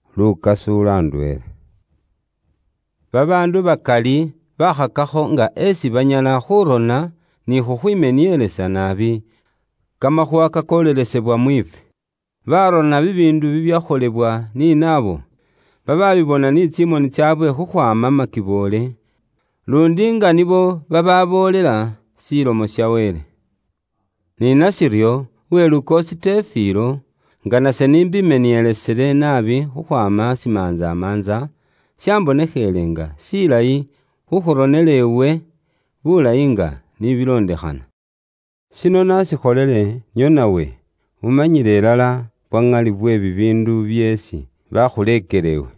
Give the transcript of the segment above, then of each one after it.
Uwelukoosi Tefilo: Babaandu bakali baakhakakho nga esi banyala khuurona ni khukhwimenielesa naabi kamakhuuwa kakolelesebwa mwiifwe. Baarona bibiindu bibyakholewa ni naabo babaabibona ni tsimoni tsaabwe khukhwaama makiboole, luundi nga nibo bababoolela Ilomo ya Wele. Ni nashiryo, Uwelukoosi Tefilo, nga nase n'imbimenielesile naabi khukhwaama shimantsamantsa, shambonekhele nga shilayi khukhuronela iwe bulayi nga ni bilondekhana. Shino ise naashikholile nio nawe wikurire ilala bwa ŋali bwe bibiindu byeesi baakhuleekela iwe.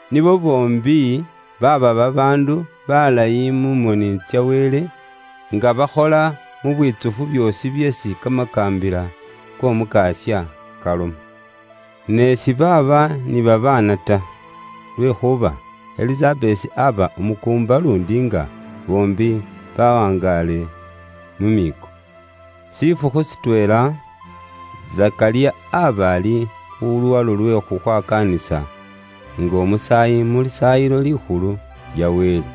Nibo boombi baaba babaandu baalayi mu moni tsa Wele, nga bakhola mu bwitsufu byoosi byeesi kamakaambila k'Omukasya kaloma. Ne sibaaba ni babaana ta, lwekhuuba Elisabesi aba umukuumba luundi nga boombi bawangaale mu miiko. Shifukhu shitweela, Zekariya aaba ali khu luwalo lwe khukhwakaanisa nga umusaayi mu Lisaayilo Likhulu lya Wele.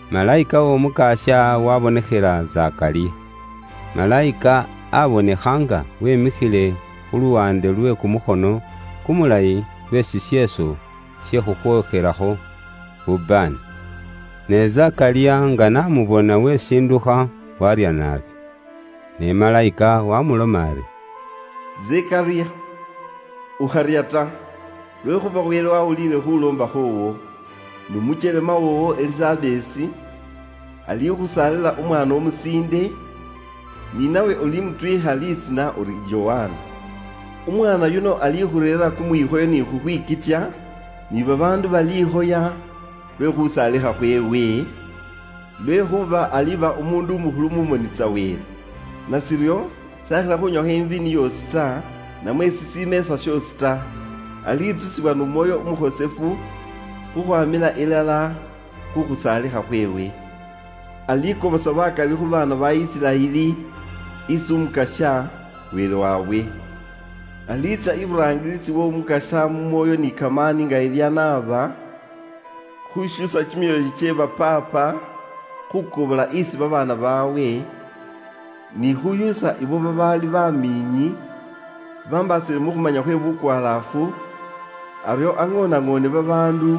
Malayika w'Omukasya waabonekhela Zekariya. Malayika aabonekha nga wimikhile khu luwaande lwe kumukhono kumulayi lwe shisheeso she khukhwookhelakho bubaane. Ne Zekariya nga n'amubona wesindukha, waarya naabi. Ne malayika waamuloma ari, “Zekariya, ukharya ta, lwekhuuba Wele waawuliile khuuloomba khwoowo, n'umukyelema woowo Elisabesi alikhusaalila umwaana umusiinde, ni nawe ulimutwiikha lisiina uri Yokana. Umwaana yuno alikhureerera kumwikhoyo ni khukhwikitya, ni babaandu baliikhoya lwe khusaalikha khweewe, lwekhuuba aliba umuundu umukhulu mu moni tsa Wele. Nashiryo, s'akhila khunywakho iviini yoosi ta, namwe shishimeesa shoosi ta. Alitsusibwa n'Umwoyo Umukhosefu khukhwamila ilala khu khusaalikha khweewe. Alikobosa bakali khu baana ba Isiraeli isi Umukasya, Wele waabwe. Aliitsya iburaangisi w'Omukasya mu mwoyo ni kamaani nga Eliya n'aba, khushuusa kimyoyo kye ba paapa khukobola isi babaana baabwe, ni khushuusa ibo babaali bamiinyi bambaasile mu khumanya khwe bukwalaafu, aryo aŋoonaŋoone babaandu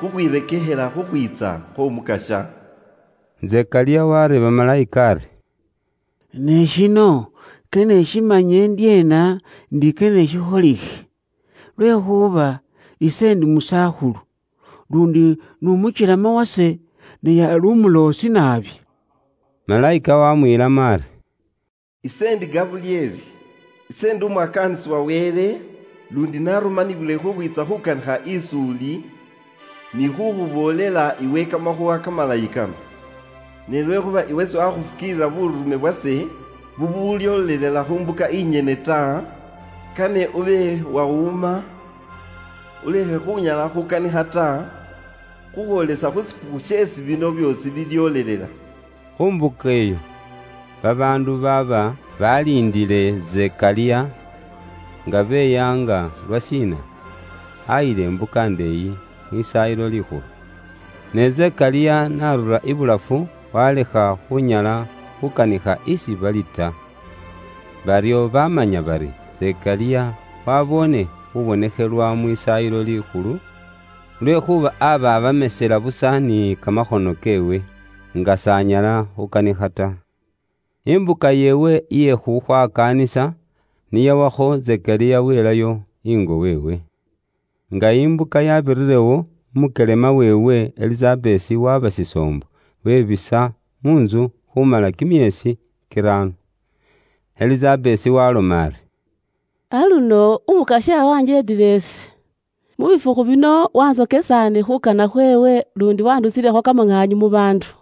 khukhwirekekhela khukhwiitsa khw'Omukasya.” Zekariya wareeba Malayika ari, “Ne shino kane ishimanye indyeena ndi kane shikholikhe? Lwekhuuba ise ndi musakhulu, luundi n'umukyelema wase naye ali umuloosi naabi.” Malayika wamwiilamo ari, “Ise indi Gabulyeli. Ise ndi umwakaanisi wa Wele, luundi narumanibwile khukhwiitsa khukanikha is'uli, ni khukhuboolela iwe Kamakhuuwa Kamalayi kano. Ne lwekhuuba iwe siwakhufukiilila buurume bwase bubulyoolelela khu mbuka inyene ta, kane ube wawuma, ulekhe khunyala khukanikha ta, khukhwoolesa khu shifukhu sheesi bino byoosi bilyoolelela.” Khu mbuka iyo, babaandu baaba baliindile Zekariya, nga beyaanga lwashiina ayila imbuka indeeyi Mwisaayilo Likhulu. Ne Zekariya n'arura ibulafu, walekha khunyala khukanikha isi bali ta. Baryo bamanya bari, Zekariya waboone khubonekhelwa Mwisaayilo Likhulu, lwekhuuba aba abamesela busa ni kamakhono keewe, nga s'anyala khukanikha ta. Imbuka yeewe iye khukhwakaanisa ni yawakho, Zekariya wilayo ingo weewe. Nga imbuka yabirirewo, umukyelema weewe Elisabesi waba shisoombo, webisa mu ntsu khumala kimyeesi kiraano. Elisabesi waaloma ari, “Aluno, Umukasya wanjeetile ise. Mu bifukhu bino wantsokesaane khuukana khweewe luundi wandusilekho kamaŋaanyu mu baandu.”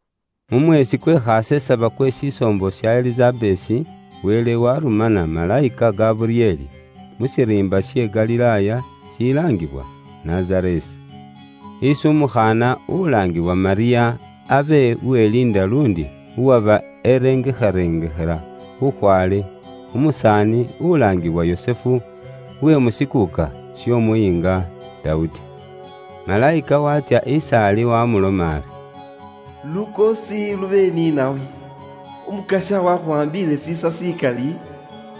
Mu mweesi kwe khasesaba kwe shisoombo sha Elisabesi, Wele warumana Malayika Gabulyeli, mu shiriimba she Galilaaya shilaangibwa Nazareesi, isi umukhaana ulaangiwa Malyamu, abe uweliinda, luundi uwaba erengarengekhela bukhwaale khu musaani ulaangiwa Yusufu, uwe mu shikuuka sh'Omuyiinga Dawudi. Malayika waatsya is'ali wamuloma ari, “Lukoosi lube ni nawe! Umukasya wakhuwaambiile iwe shiisa shikali,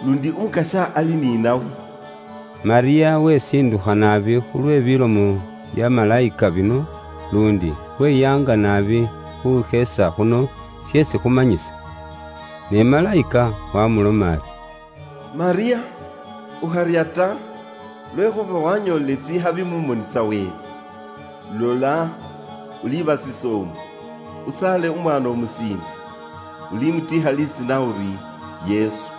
luundi Umukasya ali ni nawe.” Malyamu wesindukha naabi khu lwe bilomo bya Malayika bino, luundi weyaanga naabi khuusheesa khuno sheesi khumanyisa. Ne Malayika wamuloma ari, “Malyamu, ukharya ta! Lwekhuuba wanyoolile tsikhabi mu moni tsa Wele. Lola, uliba shisoombo, usaale umwaana umusiinde, ulimutwiikha lisiina uri, Yesu.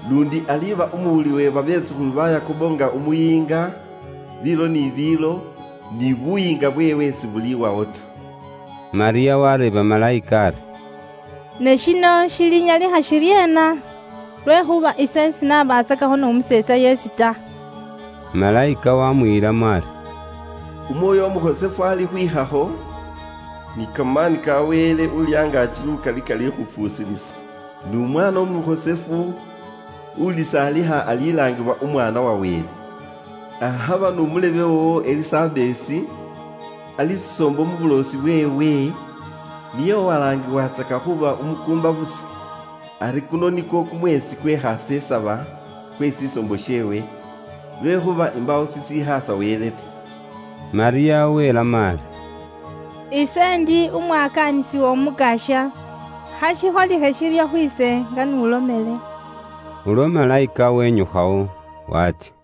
Luundi aliba umuwuli uwe babetsukhulu ba Yakobo nga Umuyiinga, biilo ni biilo, ni buyiinga bweewe sibuliwawo ta.” Malyamu wareeba Malayika ari, “Ne shino shilinyalikha shiryeena? Lwekhuuba ise sinabatsakakho n'umuseetsa yeesi ta!” Malayika wamwiilamo ari, “Umwoyo Umukhosefu alikhwikhakho, ni kamaani ka Wele Uuli Angaaki Lukali kalikhufuusilisa. N'umwaana umukhosefu ulisaalikha alilaangibwa Umwaana wa Wele. Akhaba n'umulebe woowo Elisabesi, ali shisoombo mu buloosi bweewe, niye uwalaangiwatsaka khuuba umukuumba busa. Ari kuno nikwo kumweesi kwe khasesaba kwe shisoombo sheewe. Lwekhuuba imbaawo shishikhaasa Wele ta.” Malyamu welamo ari, “Ise ndi umwakaanisi w'Omukasya, kha shikholikhe shiryo khwiise nga n'ulomele.” Ulwo Malayika wenyukhawo, waatsya.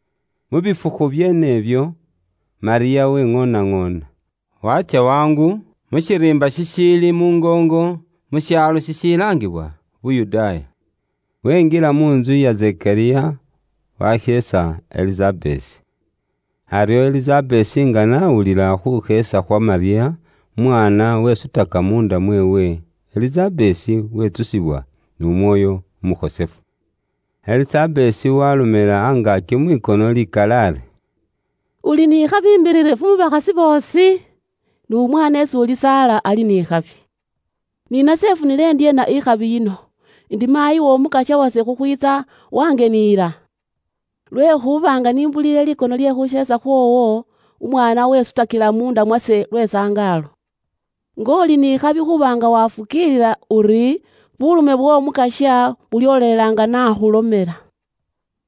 Mu bifukhu byeene ibyo, Malyamu weŋoonaŋoona, waatsya wangu mu shiriimba shishiili muungoongo, mu shaalo shishilaangibwa Yuda. Winjila mu ntsu iya Zekariya, washeesa Elisabesi. Aryo Elisabesi nga n'awulila khuusheesa khwa Malyamu, umwaana wesutaka munda mweewe, Elisabesi witsusibwa n'Umwoyo Umukhosefu. Elisabesi waalomela angaaki mwikono likali ari, “Uli ni khabi imbiririfu mu bakhasi boosi, n'umwaana isi ulisaala ali ni khabi. Ni nase ifunile indyeena ikhabi yino, indi maayi w'Omukasya wase khukhwiitsa wangeniyila? Lwekhuuba nga ise n'imbuliile likono lye khuusheesa khwoowo, umwaana wesutakila muunda mwase lwe sangaalo. Nga uli n'ikhabi khuuba nga waafukiilila uri buurume bw'Omukasya bulyoolelela nga n'akhulomela.”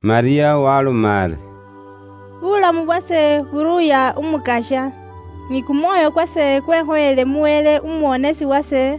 Malyamu waaloma ari, “Kumwoyo kwase kuruuya Umukasya, ni kumwoyo kwase kwekhoyeele mu Wele umuwonesi wase,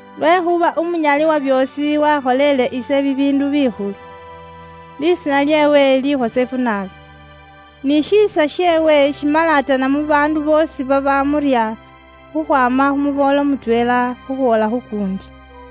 lwekhuuba umunyali wa byoosi wakholele ise bibiindu bikhulu. Lisiina lyeewe likhosefu naabi. Ni shiisa sheewe shimalatana mu baandu boosi babamurya, khukhwaama khu muboolo mutweela khukhwoola khu kuundi.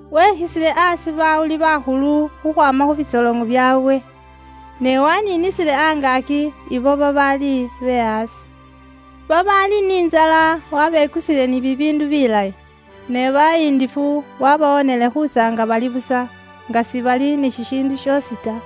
Wekhisile aasi bawuli bakhulu khukhwaama khu bitsoloŋo byaabwe, ne waniinisile angaaki ibo babaali be aasi. Babaali ni intsala wabekusile ni bibiindu bilayi, ne bayindifu wabawoonele khuutsya nga bali busa, nga sibali ni shishiindu shoosi ta.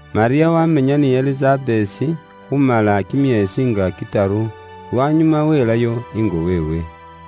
Malyamu wamenya ni Elisabesi khumala kimyeesi nga kitaru, lwanyuma welayo ingo weewe.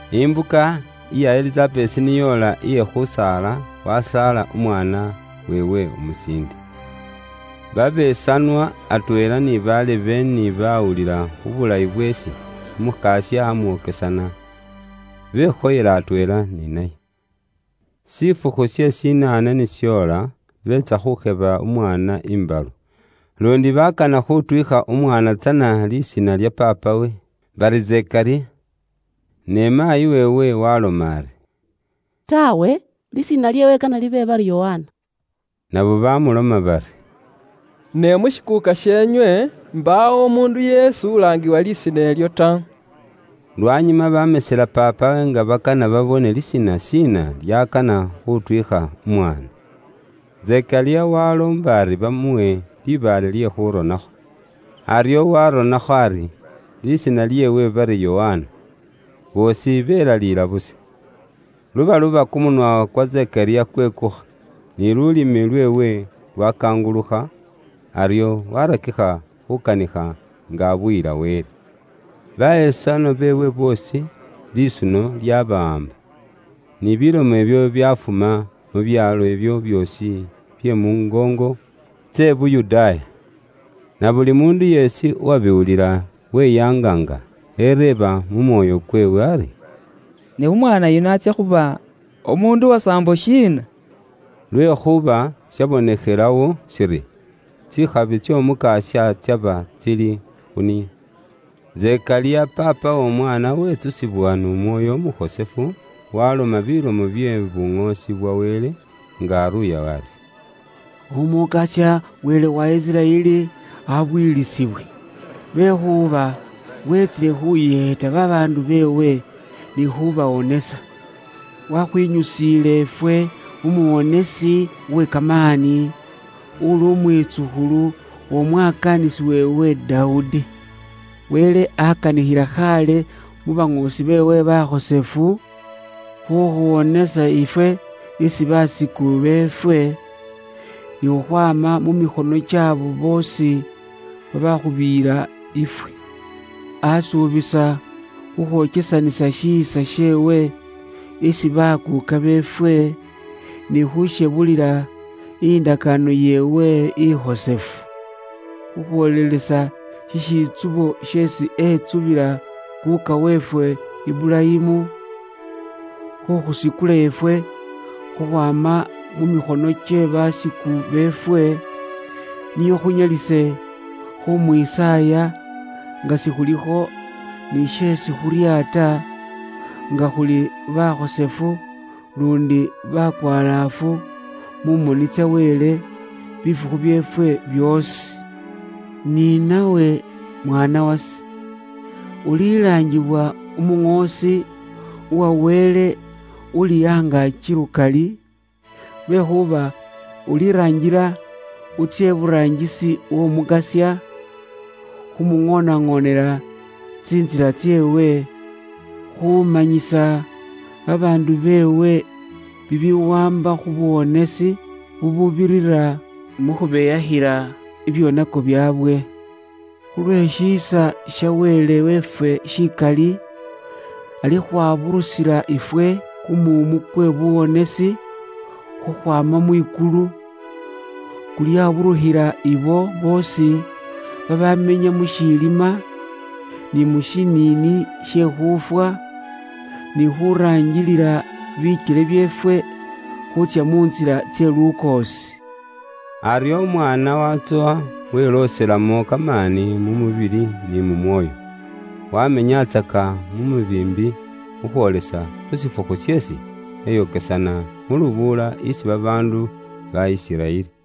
Imbuka iya Elisabesi ni yoola iye khusaala, wasaala umwaana weewe umusiinde. Babesanwa atweela ni balebe ni bawulila khu shiisa sheesi Umukasya amwokesana, bekhoyela atweela ni naye. Shifukhu she shinaane ni shoola, beetsa khukheba umwaana imbalu, luundi bakana khutwiikha umwaana tsana lisiina lya paapawe, bari Zekariya. Ne maayi weewe waaloma ari, “Taawe, lisiina lyeewe kane libe bari Yokana.” Nabo bamuloma bari, “Ne mu shikuuka sheenywe imbaawo umuundu yeesi ulaangiwa lisiina ilyo ta.” Lwanyuma bamesela paapawe nga bakana babone lisiina shiina ly'akana khutwiikha umwaana. Zekariya waloomba ari bamuwe libaale lye khuronakho, aryo waronakho ari, “Lisiina lyeewe bari Yokana.” Boosi belaliila busa. Lubaluba, kumunwa kwa Zekariya kwekukha, ni lulimi lweewe lwakangulukha, aryo warakikha khukanikha nga abuyila Wele. Babesanwa beewe boosi lisuno lyabawaamba, ni bilomo ibyo byafuma mu byaalo ibyo byoosi bye muungoongo tse i Yuda. Nabuli muundu yeesi uwabiwulila weyaanga nga ereeba mu mwoyo kweewe ari, “Ne umwaana yuno atsya khuba umuundu uwasaambo shiina?” Lwekhuuba shabonekhelawo shiri tsikhabi tsy'Omukasya tsaba tsili khu niye. Zekariya paapa w'omwaana witsusibwa n'Umwoyo Umukhosefu, waloma bilomo bye buŋoosi bwa Wele nga aruuya ari, “Umukasya Wele wa Isiraeli abuyilisibwe, lwekhuuba wetsile khuyeeta babaandu beewe ni khubawonesa. Wakhwinyusiile ifwe umuwonesi uwe kamaani, uli umwitsukhulu w'omwakaanisi weewe Dawudi. Wele akanikhila khaale mu baŋoosi beewe bakhosefu, khukhuwonesa ifwe isi basiku beefwe, ni khukhwaama mu mikhono ky'abo boosi babaakhubiiyila ifwe. Asuubisa khukhwokesanisa shiisa sheewe isi bakuuka beefwe, ni khushebulila indakaano yeewe ikhosefu, khukhwoolelesa shishitsubo sheesi etsubila kuuka weefwe Iburayimu, khukhusikula ifwe khukhwaama mu mikhono kye basiku beefwe, nio khunyalise khumwisaaya nga sikhulikho ni sheesi khuurya ta, nga khuli bakhosefu luundi bakwalaafu mu moni tsa Wele bifukhu byeefwe byoosi. Ni nawe mwaana wase, ulilaangibwa umuŋoosi uwa Wele Uuli Angaaki Lukali, lwekhuuba iwe uliraangila utsye iburaangisi w'Omukasya, khu muŋoonaŋoonela tsintsila tseewe, Khuumanyisa babaandu beewe bibiwaamba khu buwonesi, bububirira mu khubeyakhila bibyoonako byaabwe. Khulwe shiisa sha Wele weefwe shikali, alikhwaburusila ifwe kumuumu kwe buwonesi khukhwaama mwikulu; kulyaburukhila ibo boosi babamenya mu shilima, ni mu shiniini she khuufwa, ni khuraangilila bikyele byeefwe khuutsya mu ntsila tse lukoosi.” Aryo umwaana watsowa, welooselamo kamaani mu mubili ni mu mwoyo. Wamenyatsaka mu mubiimbi khukhwoolesa khu shifukhu sheesi eyokesana mu lubuula isi babaandu ba Isiraeli.